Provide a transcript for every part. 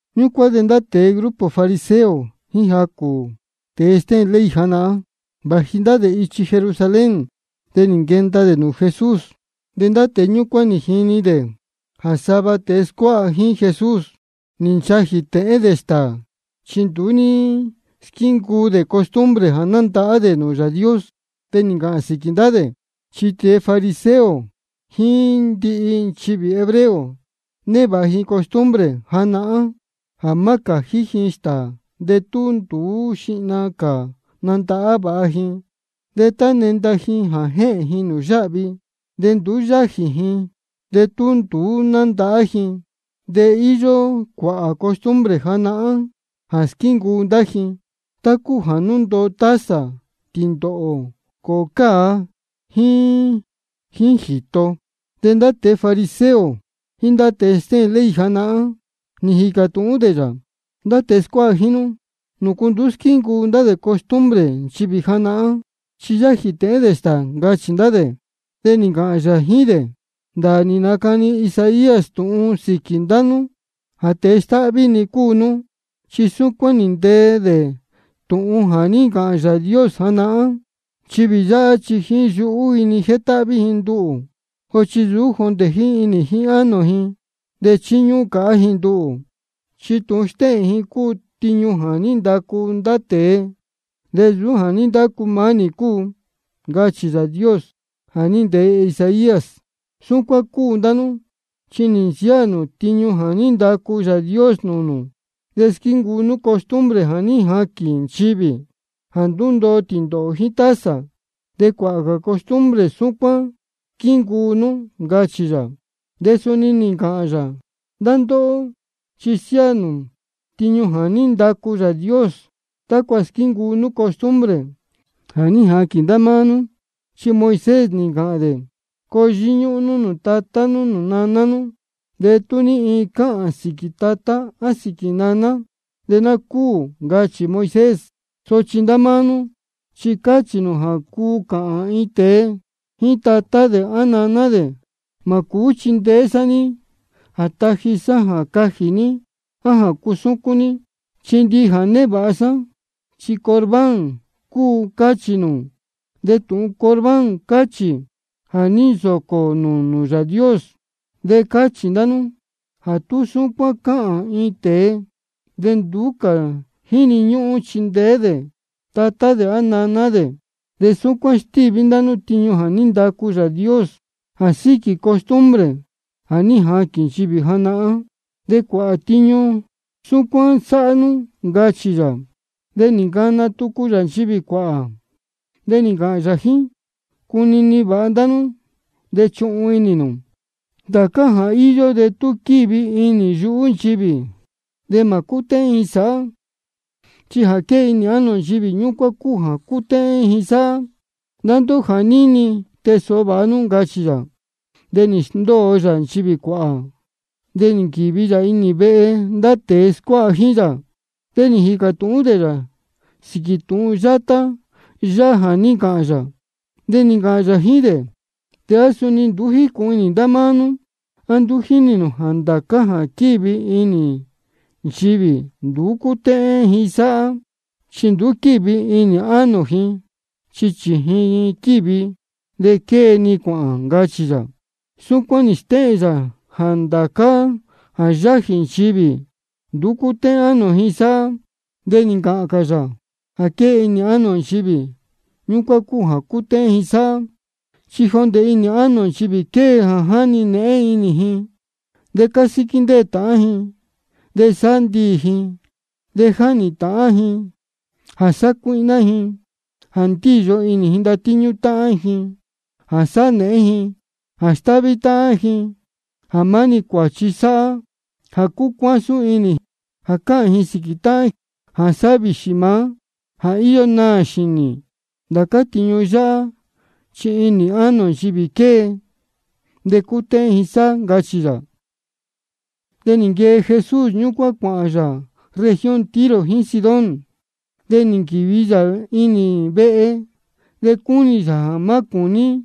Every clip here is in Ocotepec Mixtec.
Ñúcuán de ndá tēe grupo fariseo jíín jacū tēe stéhēn ley janahán, vāji ndá dē ichi Jerusalén, de nī nquenda dē nūū Jesús. De ndá tēe ñúcuán nī jinī dē jā sava tēe scuáha jíín Jesús, nī nchajī tēhén dē stāā, chi nduú ní squíncuu dē costumbre jā nandahá dē nūū Yāā Dios. De nī ncāhān sīquī ndá dē. Chi tēe fariseo jíín ndihi nchivī hebreo, névāha ji costumbre janahán jā má cājí ji stāā de tú nduú xihna cā nandahá vāha ji. De tá nénda ji jā jéhēn ji nūū yáhvi, de nduú yájī ji de tú nduú nándahá ji. De íyó cuāhā cā costumbre janahán jā squíncuu ndá ji, tá cúu jā ndúndoo taza, tīndōhō, cōhō cāa, jíín jīto. De ndá tēe fariseo jíín ndá tēe stéhēn ley janahán, nī jīcā tūhún dē yā: Ndá tēe scuáha jíín nú, ¿nūcu nduú squíncuu dē costumbre nchivī janahán, chi sa yájī tēhén dē stāā? ncachī dē. De nī ncāhān yā jíín dē: Ndāā nī nacani Isaías tūhun sīquī ndá nú jā tēe stáhví-ni cúu nú. Chi súcuán nī ntee dē tūhun jā ní ncāhān Yāā Dios janahán: Nchivī yáhá chi jíín yuhú ji-ni jétáhví ji nduhū, sochi nsūú jondē jíín inī jíín ánō ji. De chíñúhún cāhá ji nduhū, chi tūhun stéhēn ji cúu tiñu jā ní ndacu ndá tēe, de nsūú jā ní ndacu maá nī cúu. Ncachī Yāā Dios jā ní ntee Isaías. Súcuán cúu ndá nú, chi nī nsiáā nū tiñu jā ní ndacu Yāā Dios nūū nū, de squíncuu nú costumbre jā ní jaquīn nchivī, jā ndúndoo tīndōhō jíín taza. De cuāhā cā costumbre súcuán squíncuu nú, ncachī yā. De suni nī ncāhān yā: Ndá ndóhó chi siáā nū tiñu jā ní ndacu Yāā Dios tácua squíncuu nú costumbre jā ní jaquīn ndá máá nú. Chi Moisés nī ncāhān dē: Coo yíñúhún nú nūū tatá nú nūū naná nú. De tú ní iin cāhān sīquī tatá á sīquī naná, de ná cúū, ncachī Moisés. Sochi ndá máá nú chi cáchī nū jā cuu cāhān iin tēe jíín tatá dē á naná dē: Mā cūú chindeé sá ní jā taji sá jā cajī ní á jā cusúcún ní, chi ndihi jā névāha sá, chi Corbán cúu, cáchī nū. (De tūhun Corbán cáchī: Ja nī nsōcō dē nūū Yāā Dios.) De cáchī ndá nú jā tú súcuán cáhān iin tēe de nduú cā jíni ñúhún chindeé dē tatá dē á naná dē. De súcuán stíví ndá nú tiñu jā ní ndacu Yāā Dios, jā síquī costumbre jā ní jaquīn nchivī janahán. De cuāhā cā tiñu súcuán sáhá nú, ncachī yā. De nī ncana tucu yā nchivī cuāhā, de nī ncāhān yā jíín ji: Cunini vāha ndá nú de chuhun inī nū: Ndācá jā íyó de tú quívi inī yuhú nchivī, de mā cútéhén ji sāhá. Chi jā quée inī ánō nchivī, ñúcuán cúu jā cútéhén ji sáhá. Ndá ndóhó jā níni, tee sōho vāha nú, ncachī yā. De nī sndóo yā nchivī cuāhā, de nī nquīvi yā inī vehe. De ndá tēe scuáha jíín yā, nī jīcā tūhún dē yā sīquī tūhun yátá yáhá jā ní ncāhān yā. De nī ncāhān yā jíín dē: ¿A suni nduú jícūhun inī ndá máá nú? ¿A nduú jínī nū jā ndācá jā quívi inī nchivī, nduú cútéhén ji sáhá? Chi nduú quívi inī ánō ji, chi chījin ji quívi, de quée-ni cuāhān, ncachī yā. Súcuán nī stéhēn yā jā ndācá jā yájī nchivī, nduú cútéhén ánō ji sáhá. De nī ncāhān cā yā: Jā quée inī ánō nchivī, ñúcuán cúu jā cútéhén ji sáhá. Chi jondē inī ánō nchivī quée jā jáni nēhén inī, jā cásíquí ndéē táhán, jā sáhá ndiī, jā jáhnī ndīyi, jā sácuíhná, jā ndíyo inī ndatíñú táhán, jā sáhá nēhén, jā stáhví táhán, jā maá-ni cuāchi sáhá, jā cúcuásún inī, jā cáhān sīquī táhán, jā sáhá vīxī maá, jā íyó naā xīnī. Ndācá tiñu néhén yáhá chi inī ánō nchivī quée, de cútéhén ji sáhá, ncachī yā. De nī nquee Jesús ñúcuán cuāhān yā región Tiro jíín Sidón. De nī nquīvi yā iin vehe, de cúnī yā jā má cūní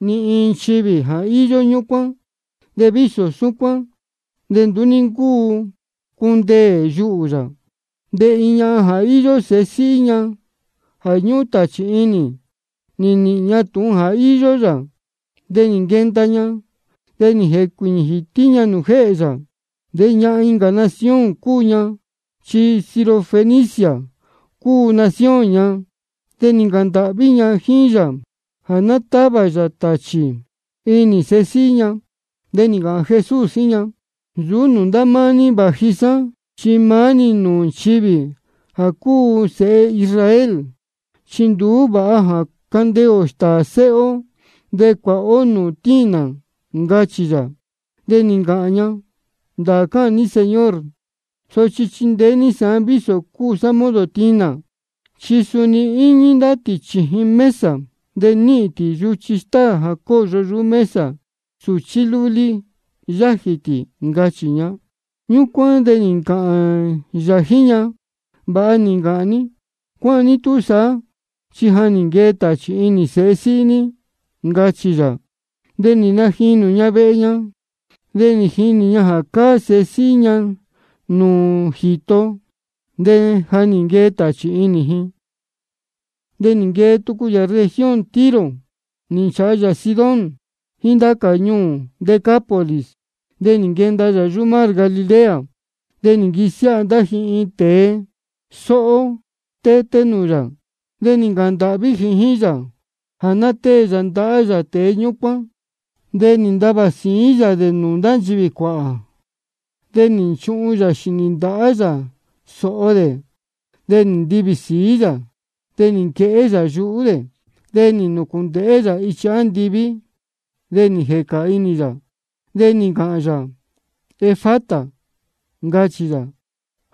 ni iin nchivī jā íyó yā ñúcuán. De vísō súcuán, de nduú ní ncúu cundeē yuhū yā. De iin ñahan jā íyó sēhe síhí ña jā ñúhún tāchī inī, nī nīhīn ña tūhun jā íyó yā. De nī nquenda ña, de nī jēcuīñī jītí ña nūū jéhē yā. De ñahan incā nación cúu ña, chi Sirofenicia cúu nación ña. De nī ncāhān ndāhví ña jíín yā jā ná távā yā tāchī inī sēhe síhí ña. De nī ncāhān Jesús jíín ña: Nsūú nūū ndá máá ní vāji sá, chi maá-ni nūū nchivī jā cúu sēhe Israel. Chi nduú vāha jā candeē ō stāā sēhe ó de cuāha ó nūū tinā, ncachī yā. De nī ncāhān ña: Ndāā cáhān ní Señor, sochi chindeé ní sāán vísō cúu sá modo tinā. Chi suni íñí ndá tī chījin mesa, de níhīn tī yuchi stáā jā cóyo yuhú sūchí lúlí yájī tī, ncachī ña. Ñúcuán de nī ncāhān yā jíín ña: Vāha nī ncāhān ní. Cuáhán ní túsaá, chi ja nī nquee tāchī inī sēhe síhí ní, ncachī yā. De nī najinū ña vehe ña, de nī jinī ña jā cáá sēhe síhí ña nūū jīto, de ja nī nquee tāchī inī ji. De nī nquee tucu yā región Tiro, nī nchāha yā Sidón jíín ndācá ñuū Decápolis, de nī nquenda yā mar Galilea. De nī nquisiáha ndá ji iin tēe sóhó stété nūū yā, de nī ncāhān ndāhví ji jíín yā jā ná tée yā ndahá yā tēe ñúcuán. De nī ntavā sīín yā dē nūū ndá nchivī cuāhā, de nī nchuhun yā xīnī ndahá yā sōho dē, de nī ntivī sīí yā, de nī nquehé yā yáá dē. De nī nūcūndēhé yā ichi andiví, de nī jēca inī yā, de nī ncāhān yā: Efata, ncachī yā,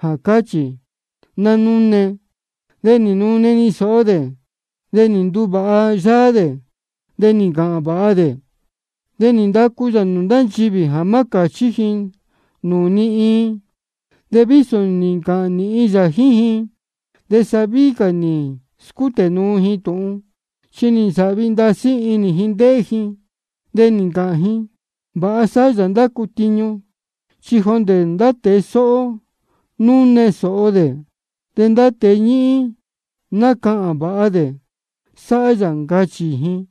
jā cáchī: Nanune. De nī nune-ni sōho dē, de nī nduvāha yáá dē, de nī ncāhān vāha dē. De nī ndacu yā nūū ndá nchivī jā má cāchí ji nūū ni iin. De vísō nī ncāhān nīhin yā jíín ji, de sa víhí cā nī scútē nuu ji tūhun. Chi nī nsāhvi ndasí inī ji ndéhé ji, de nī ncāhān ji: Vāha sáhá yā ndācá tiñu, chi jondē ndá tēe sóhó núne sōho dē, de ndá tēe ñíhín nácahān vāha dē sáhá yā, ncachī ji.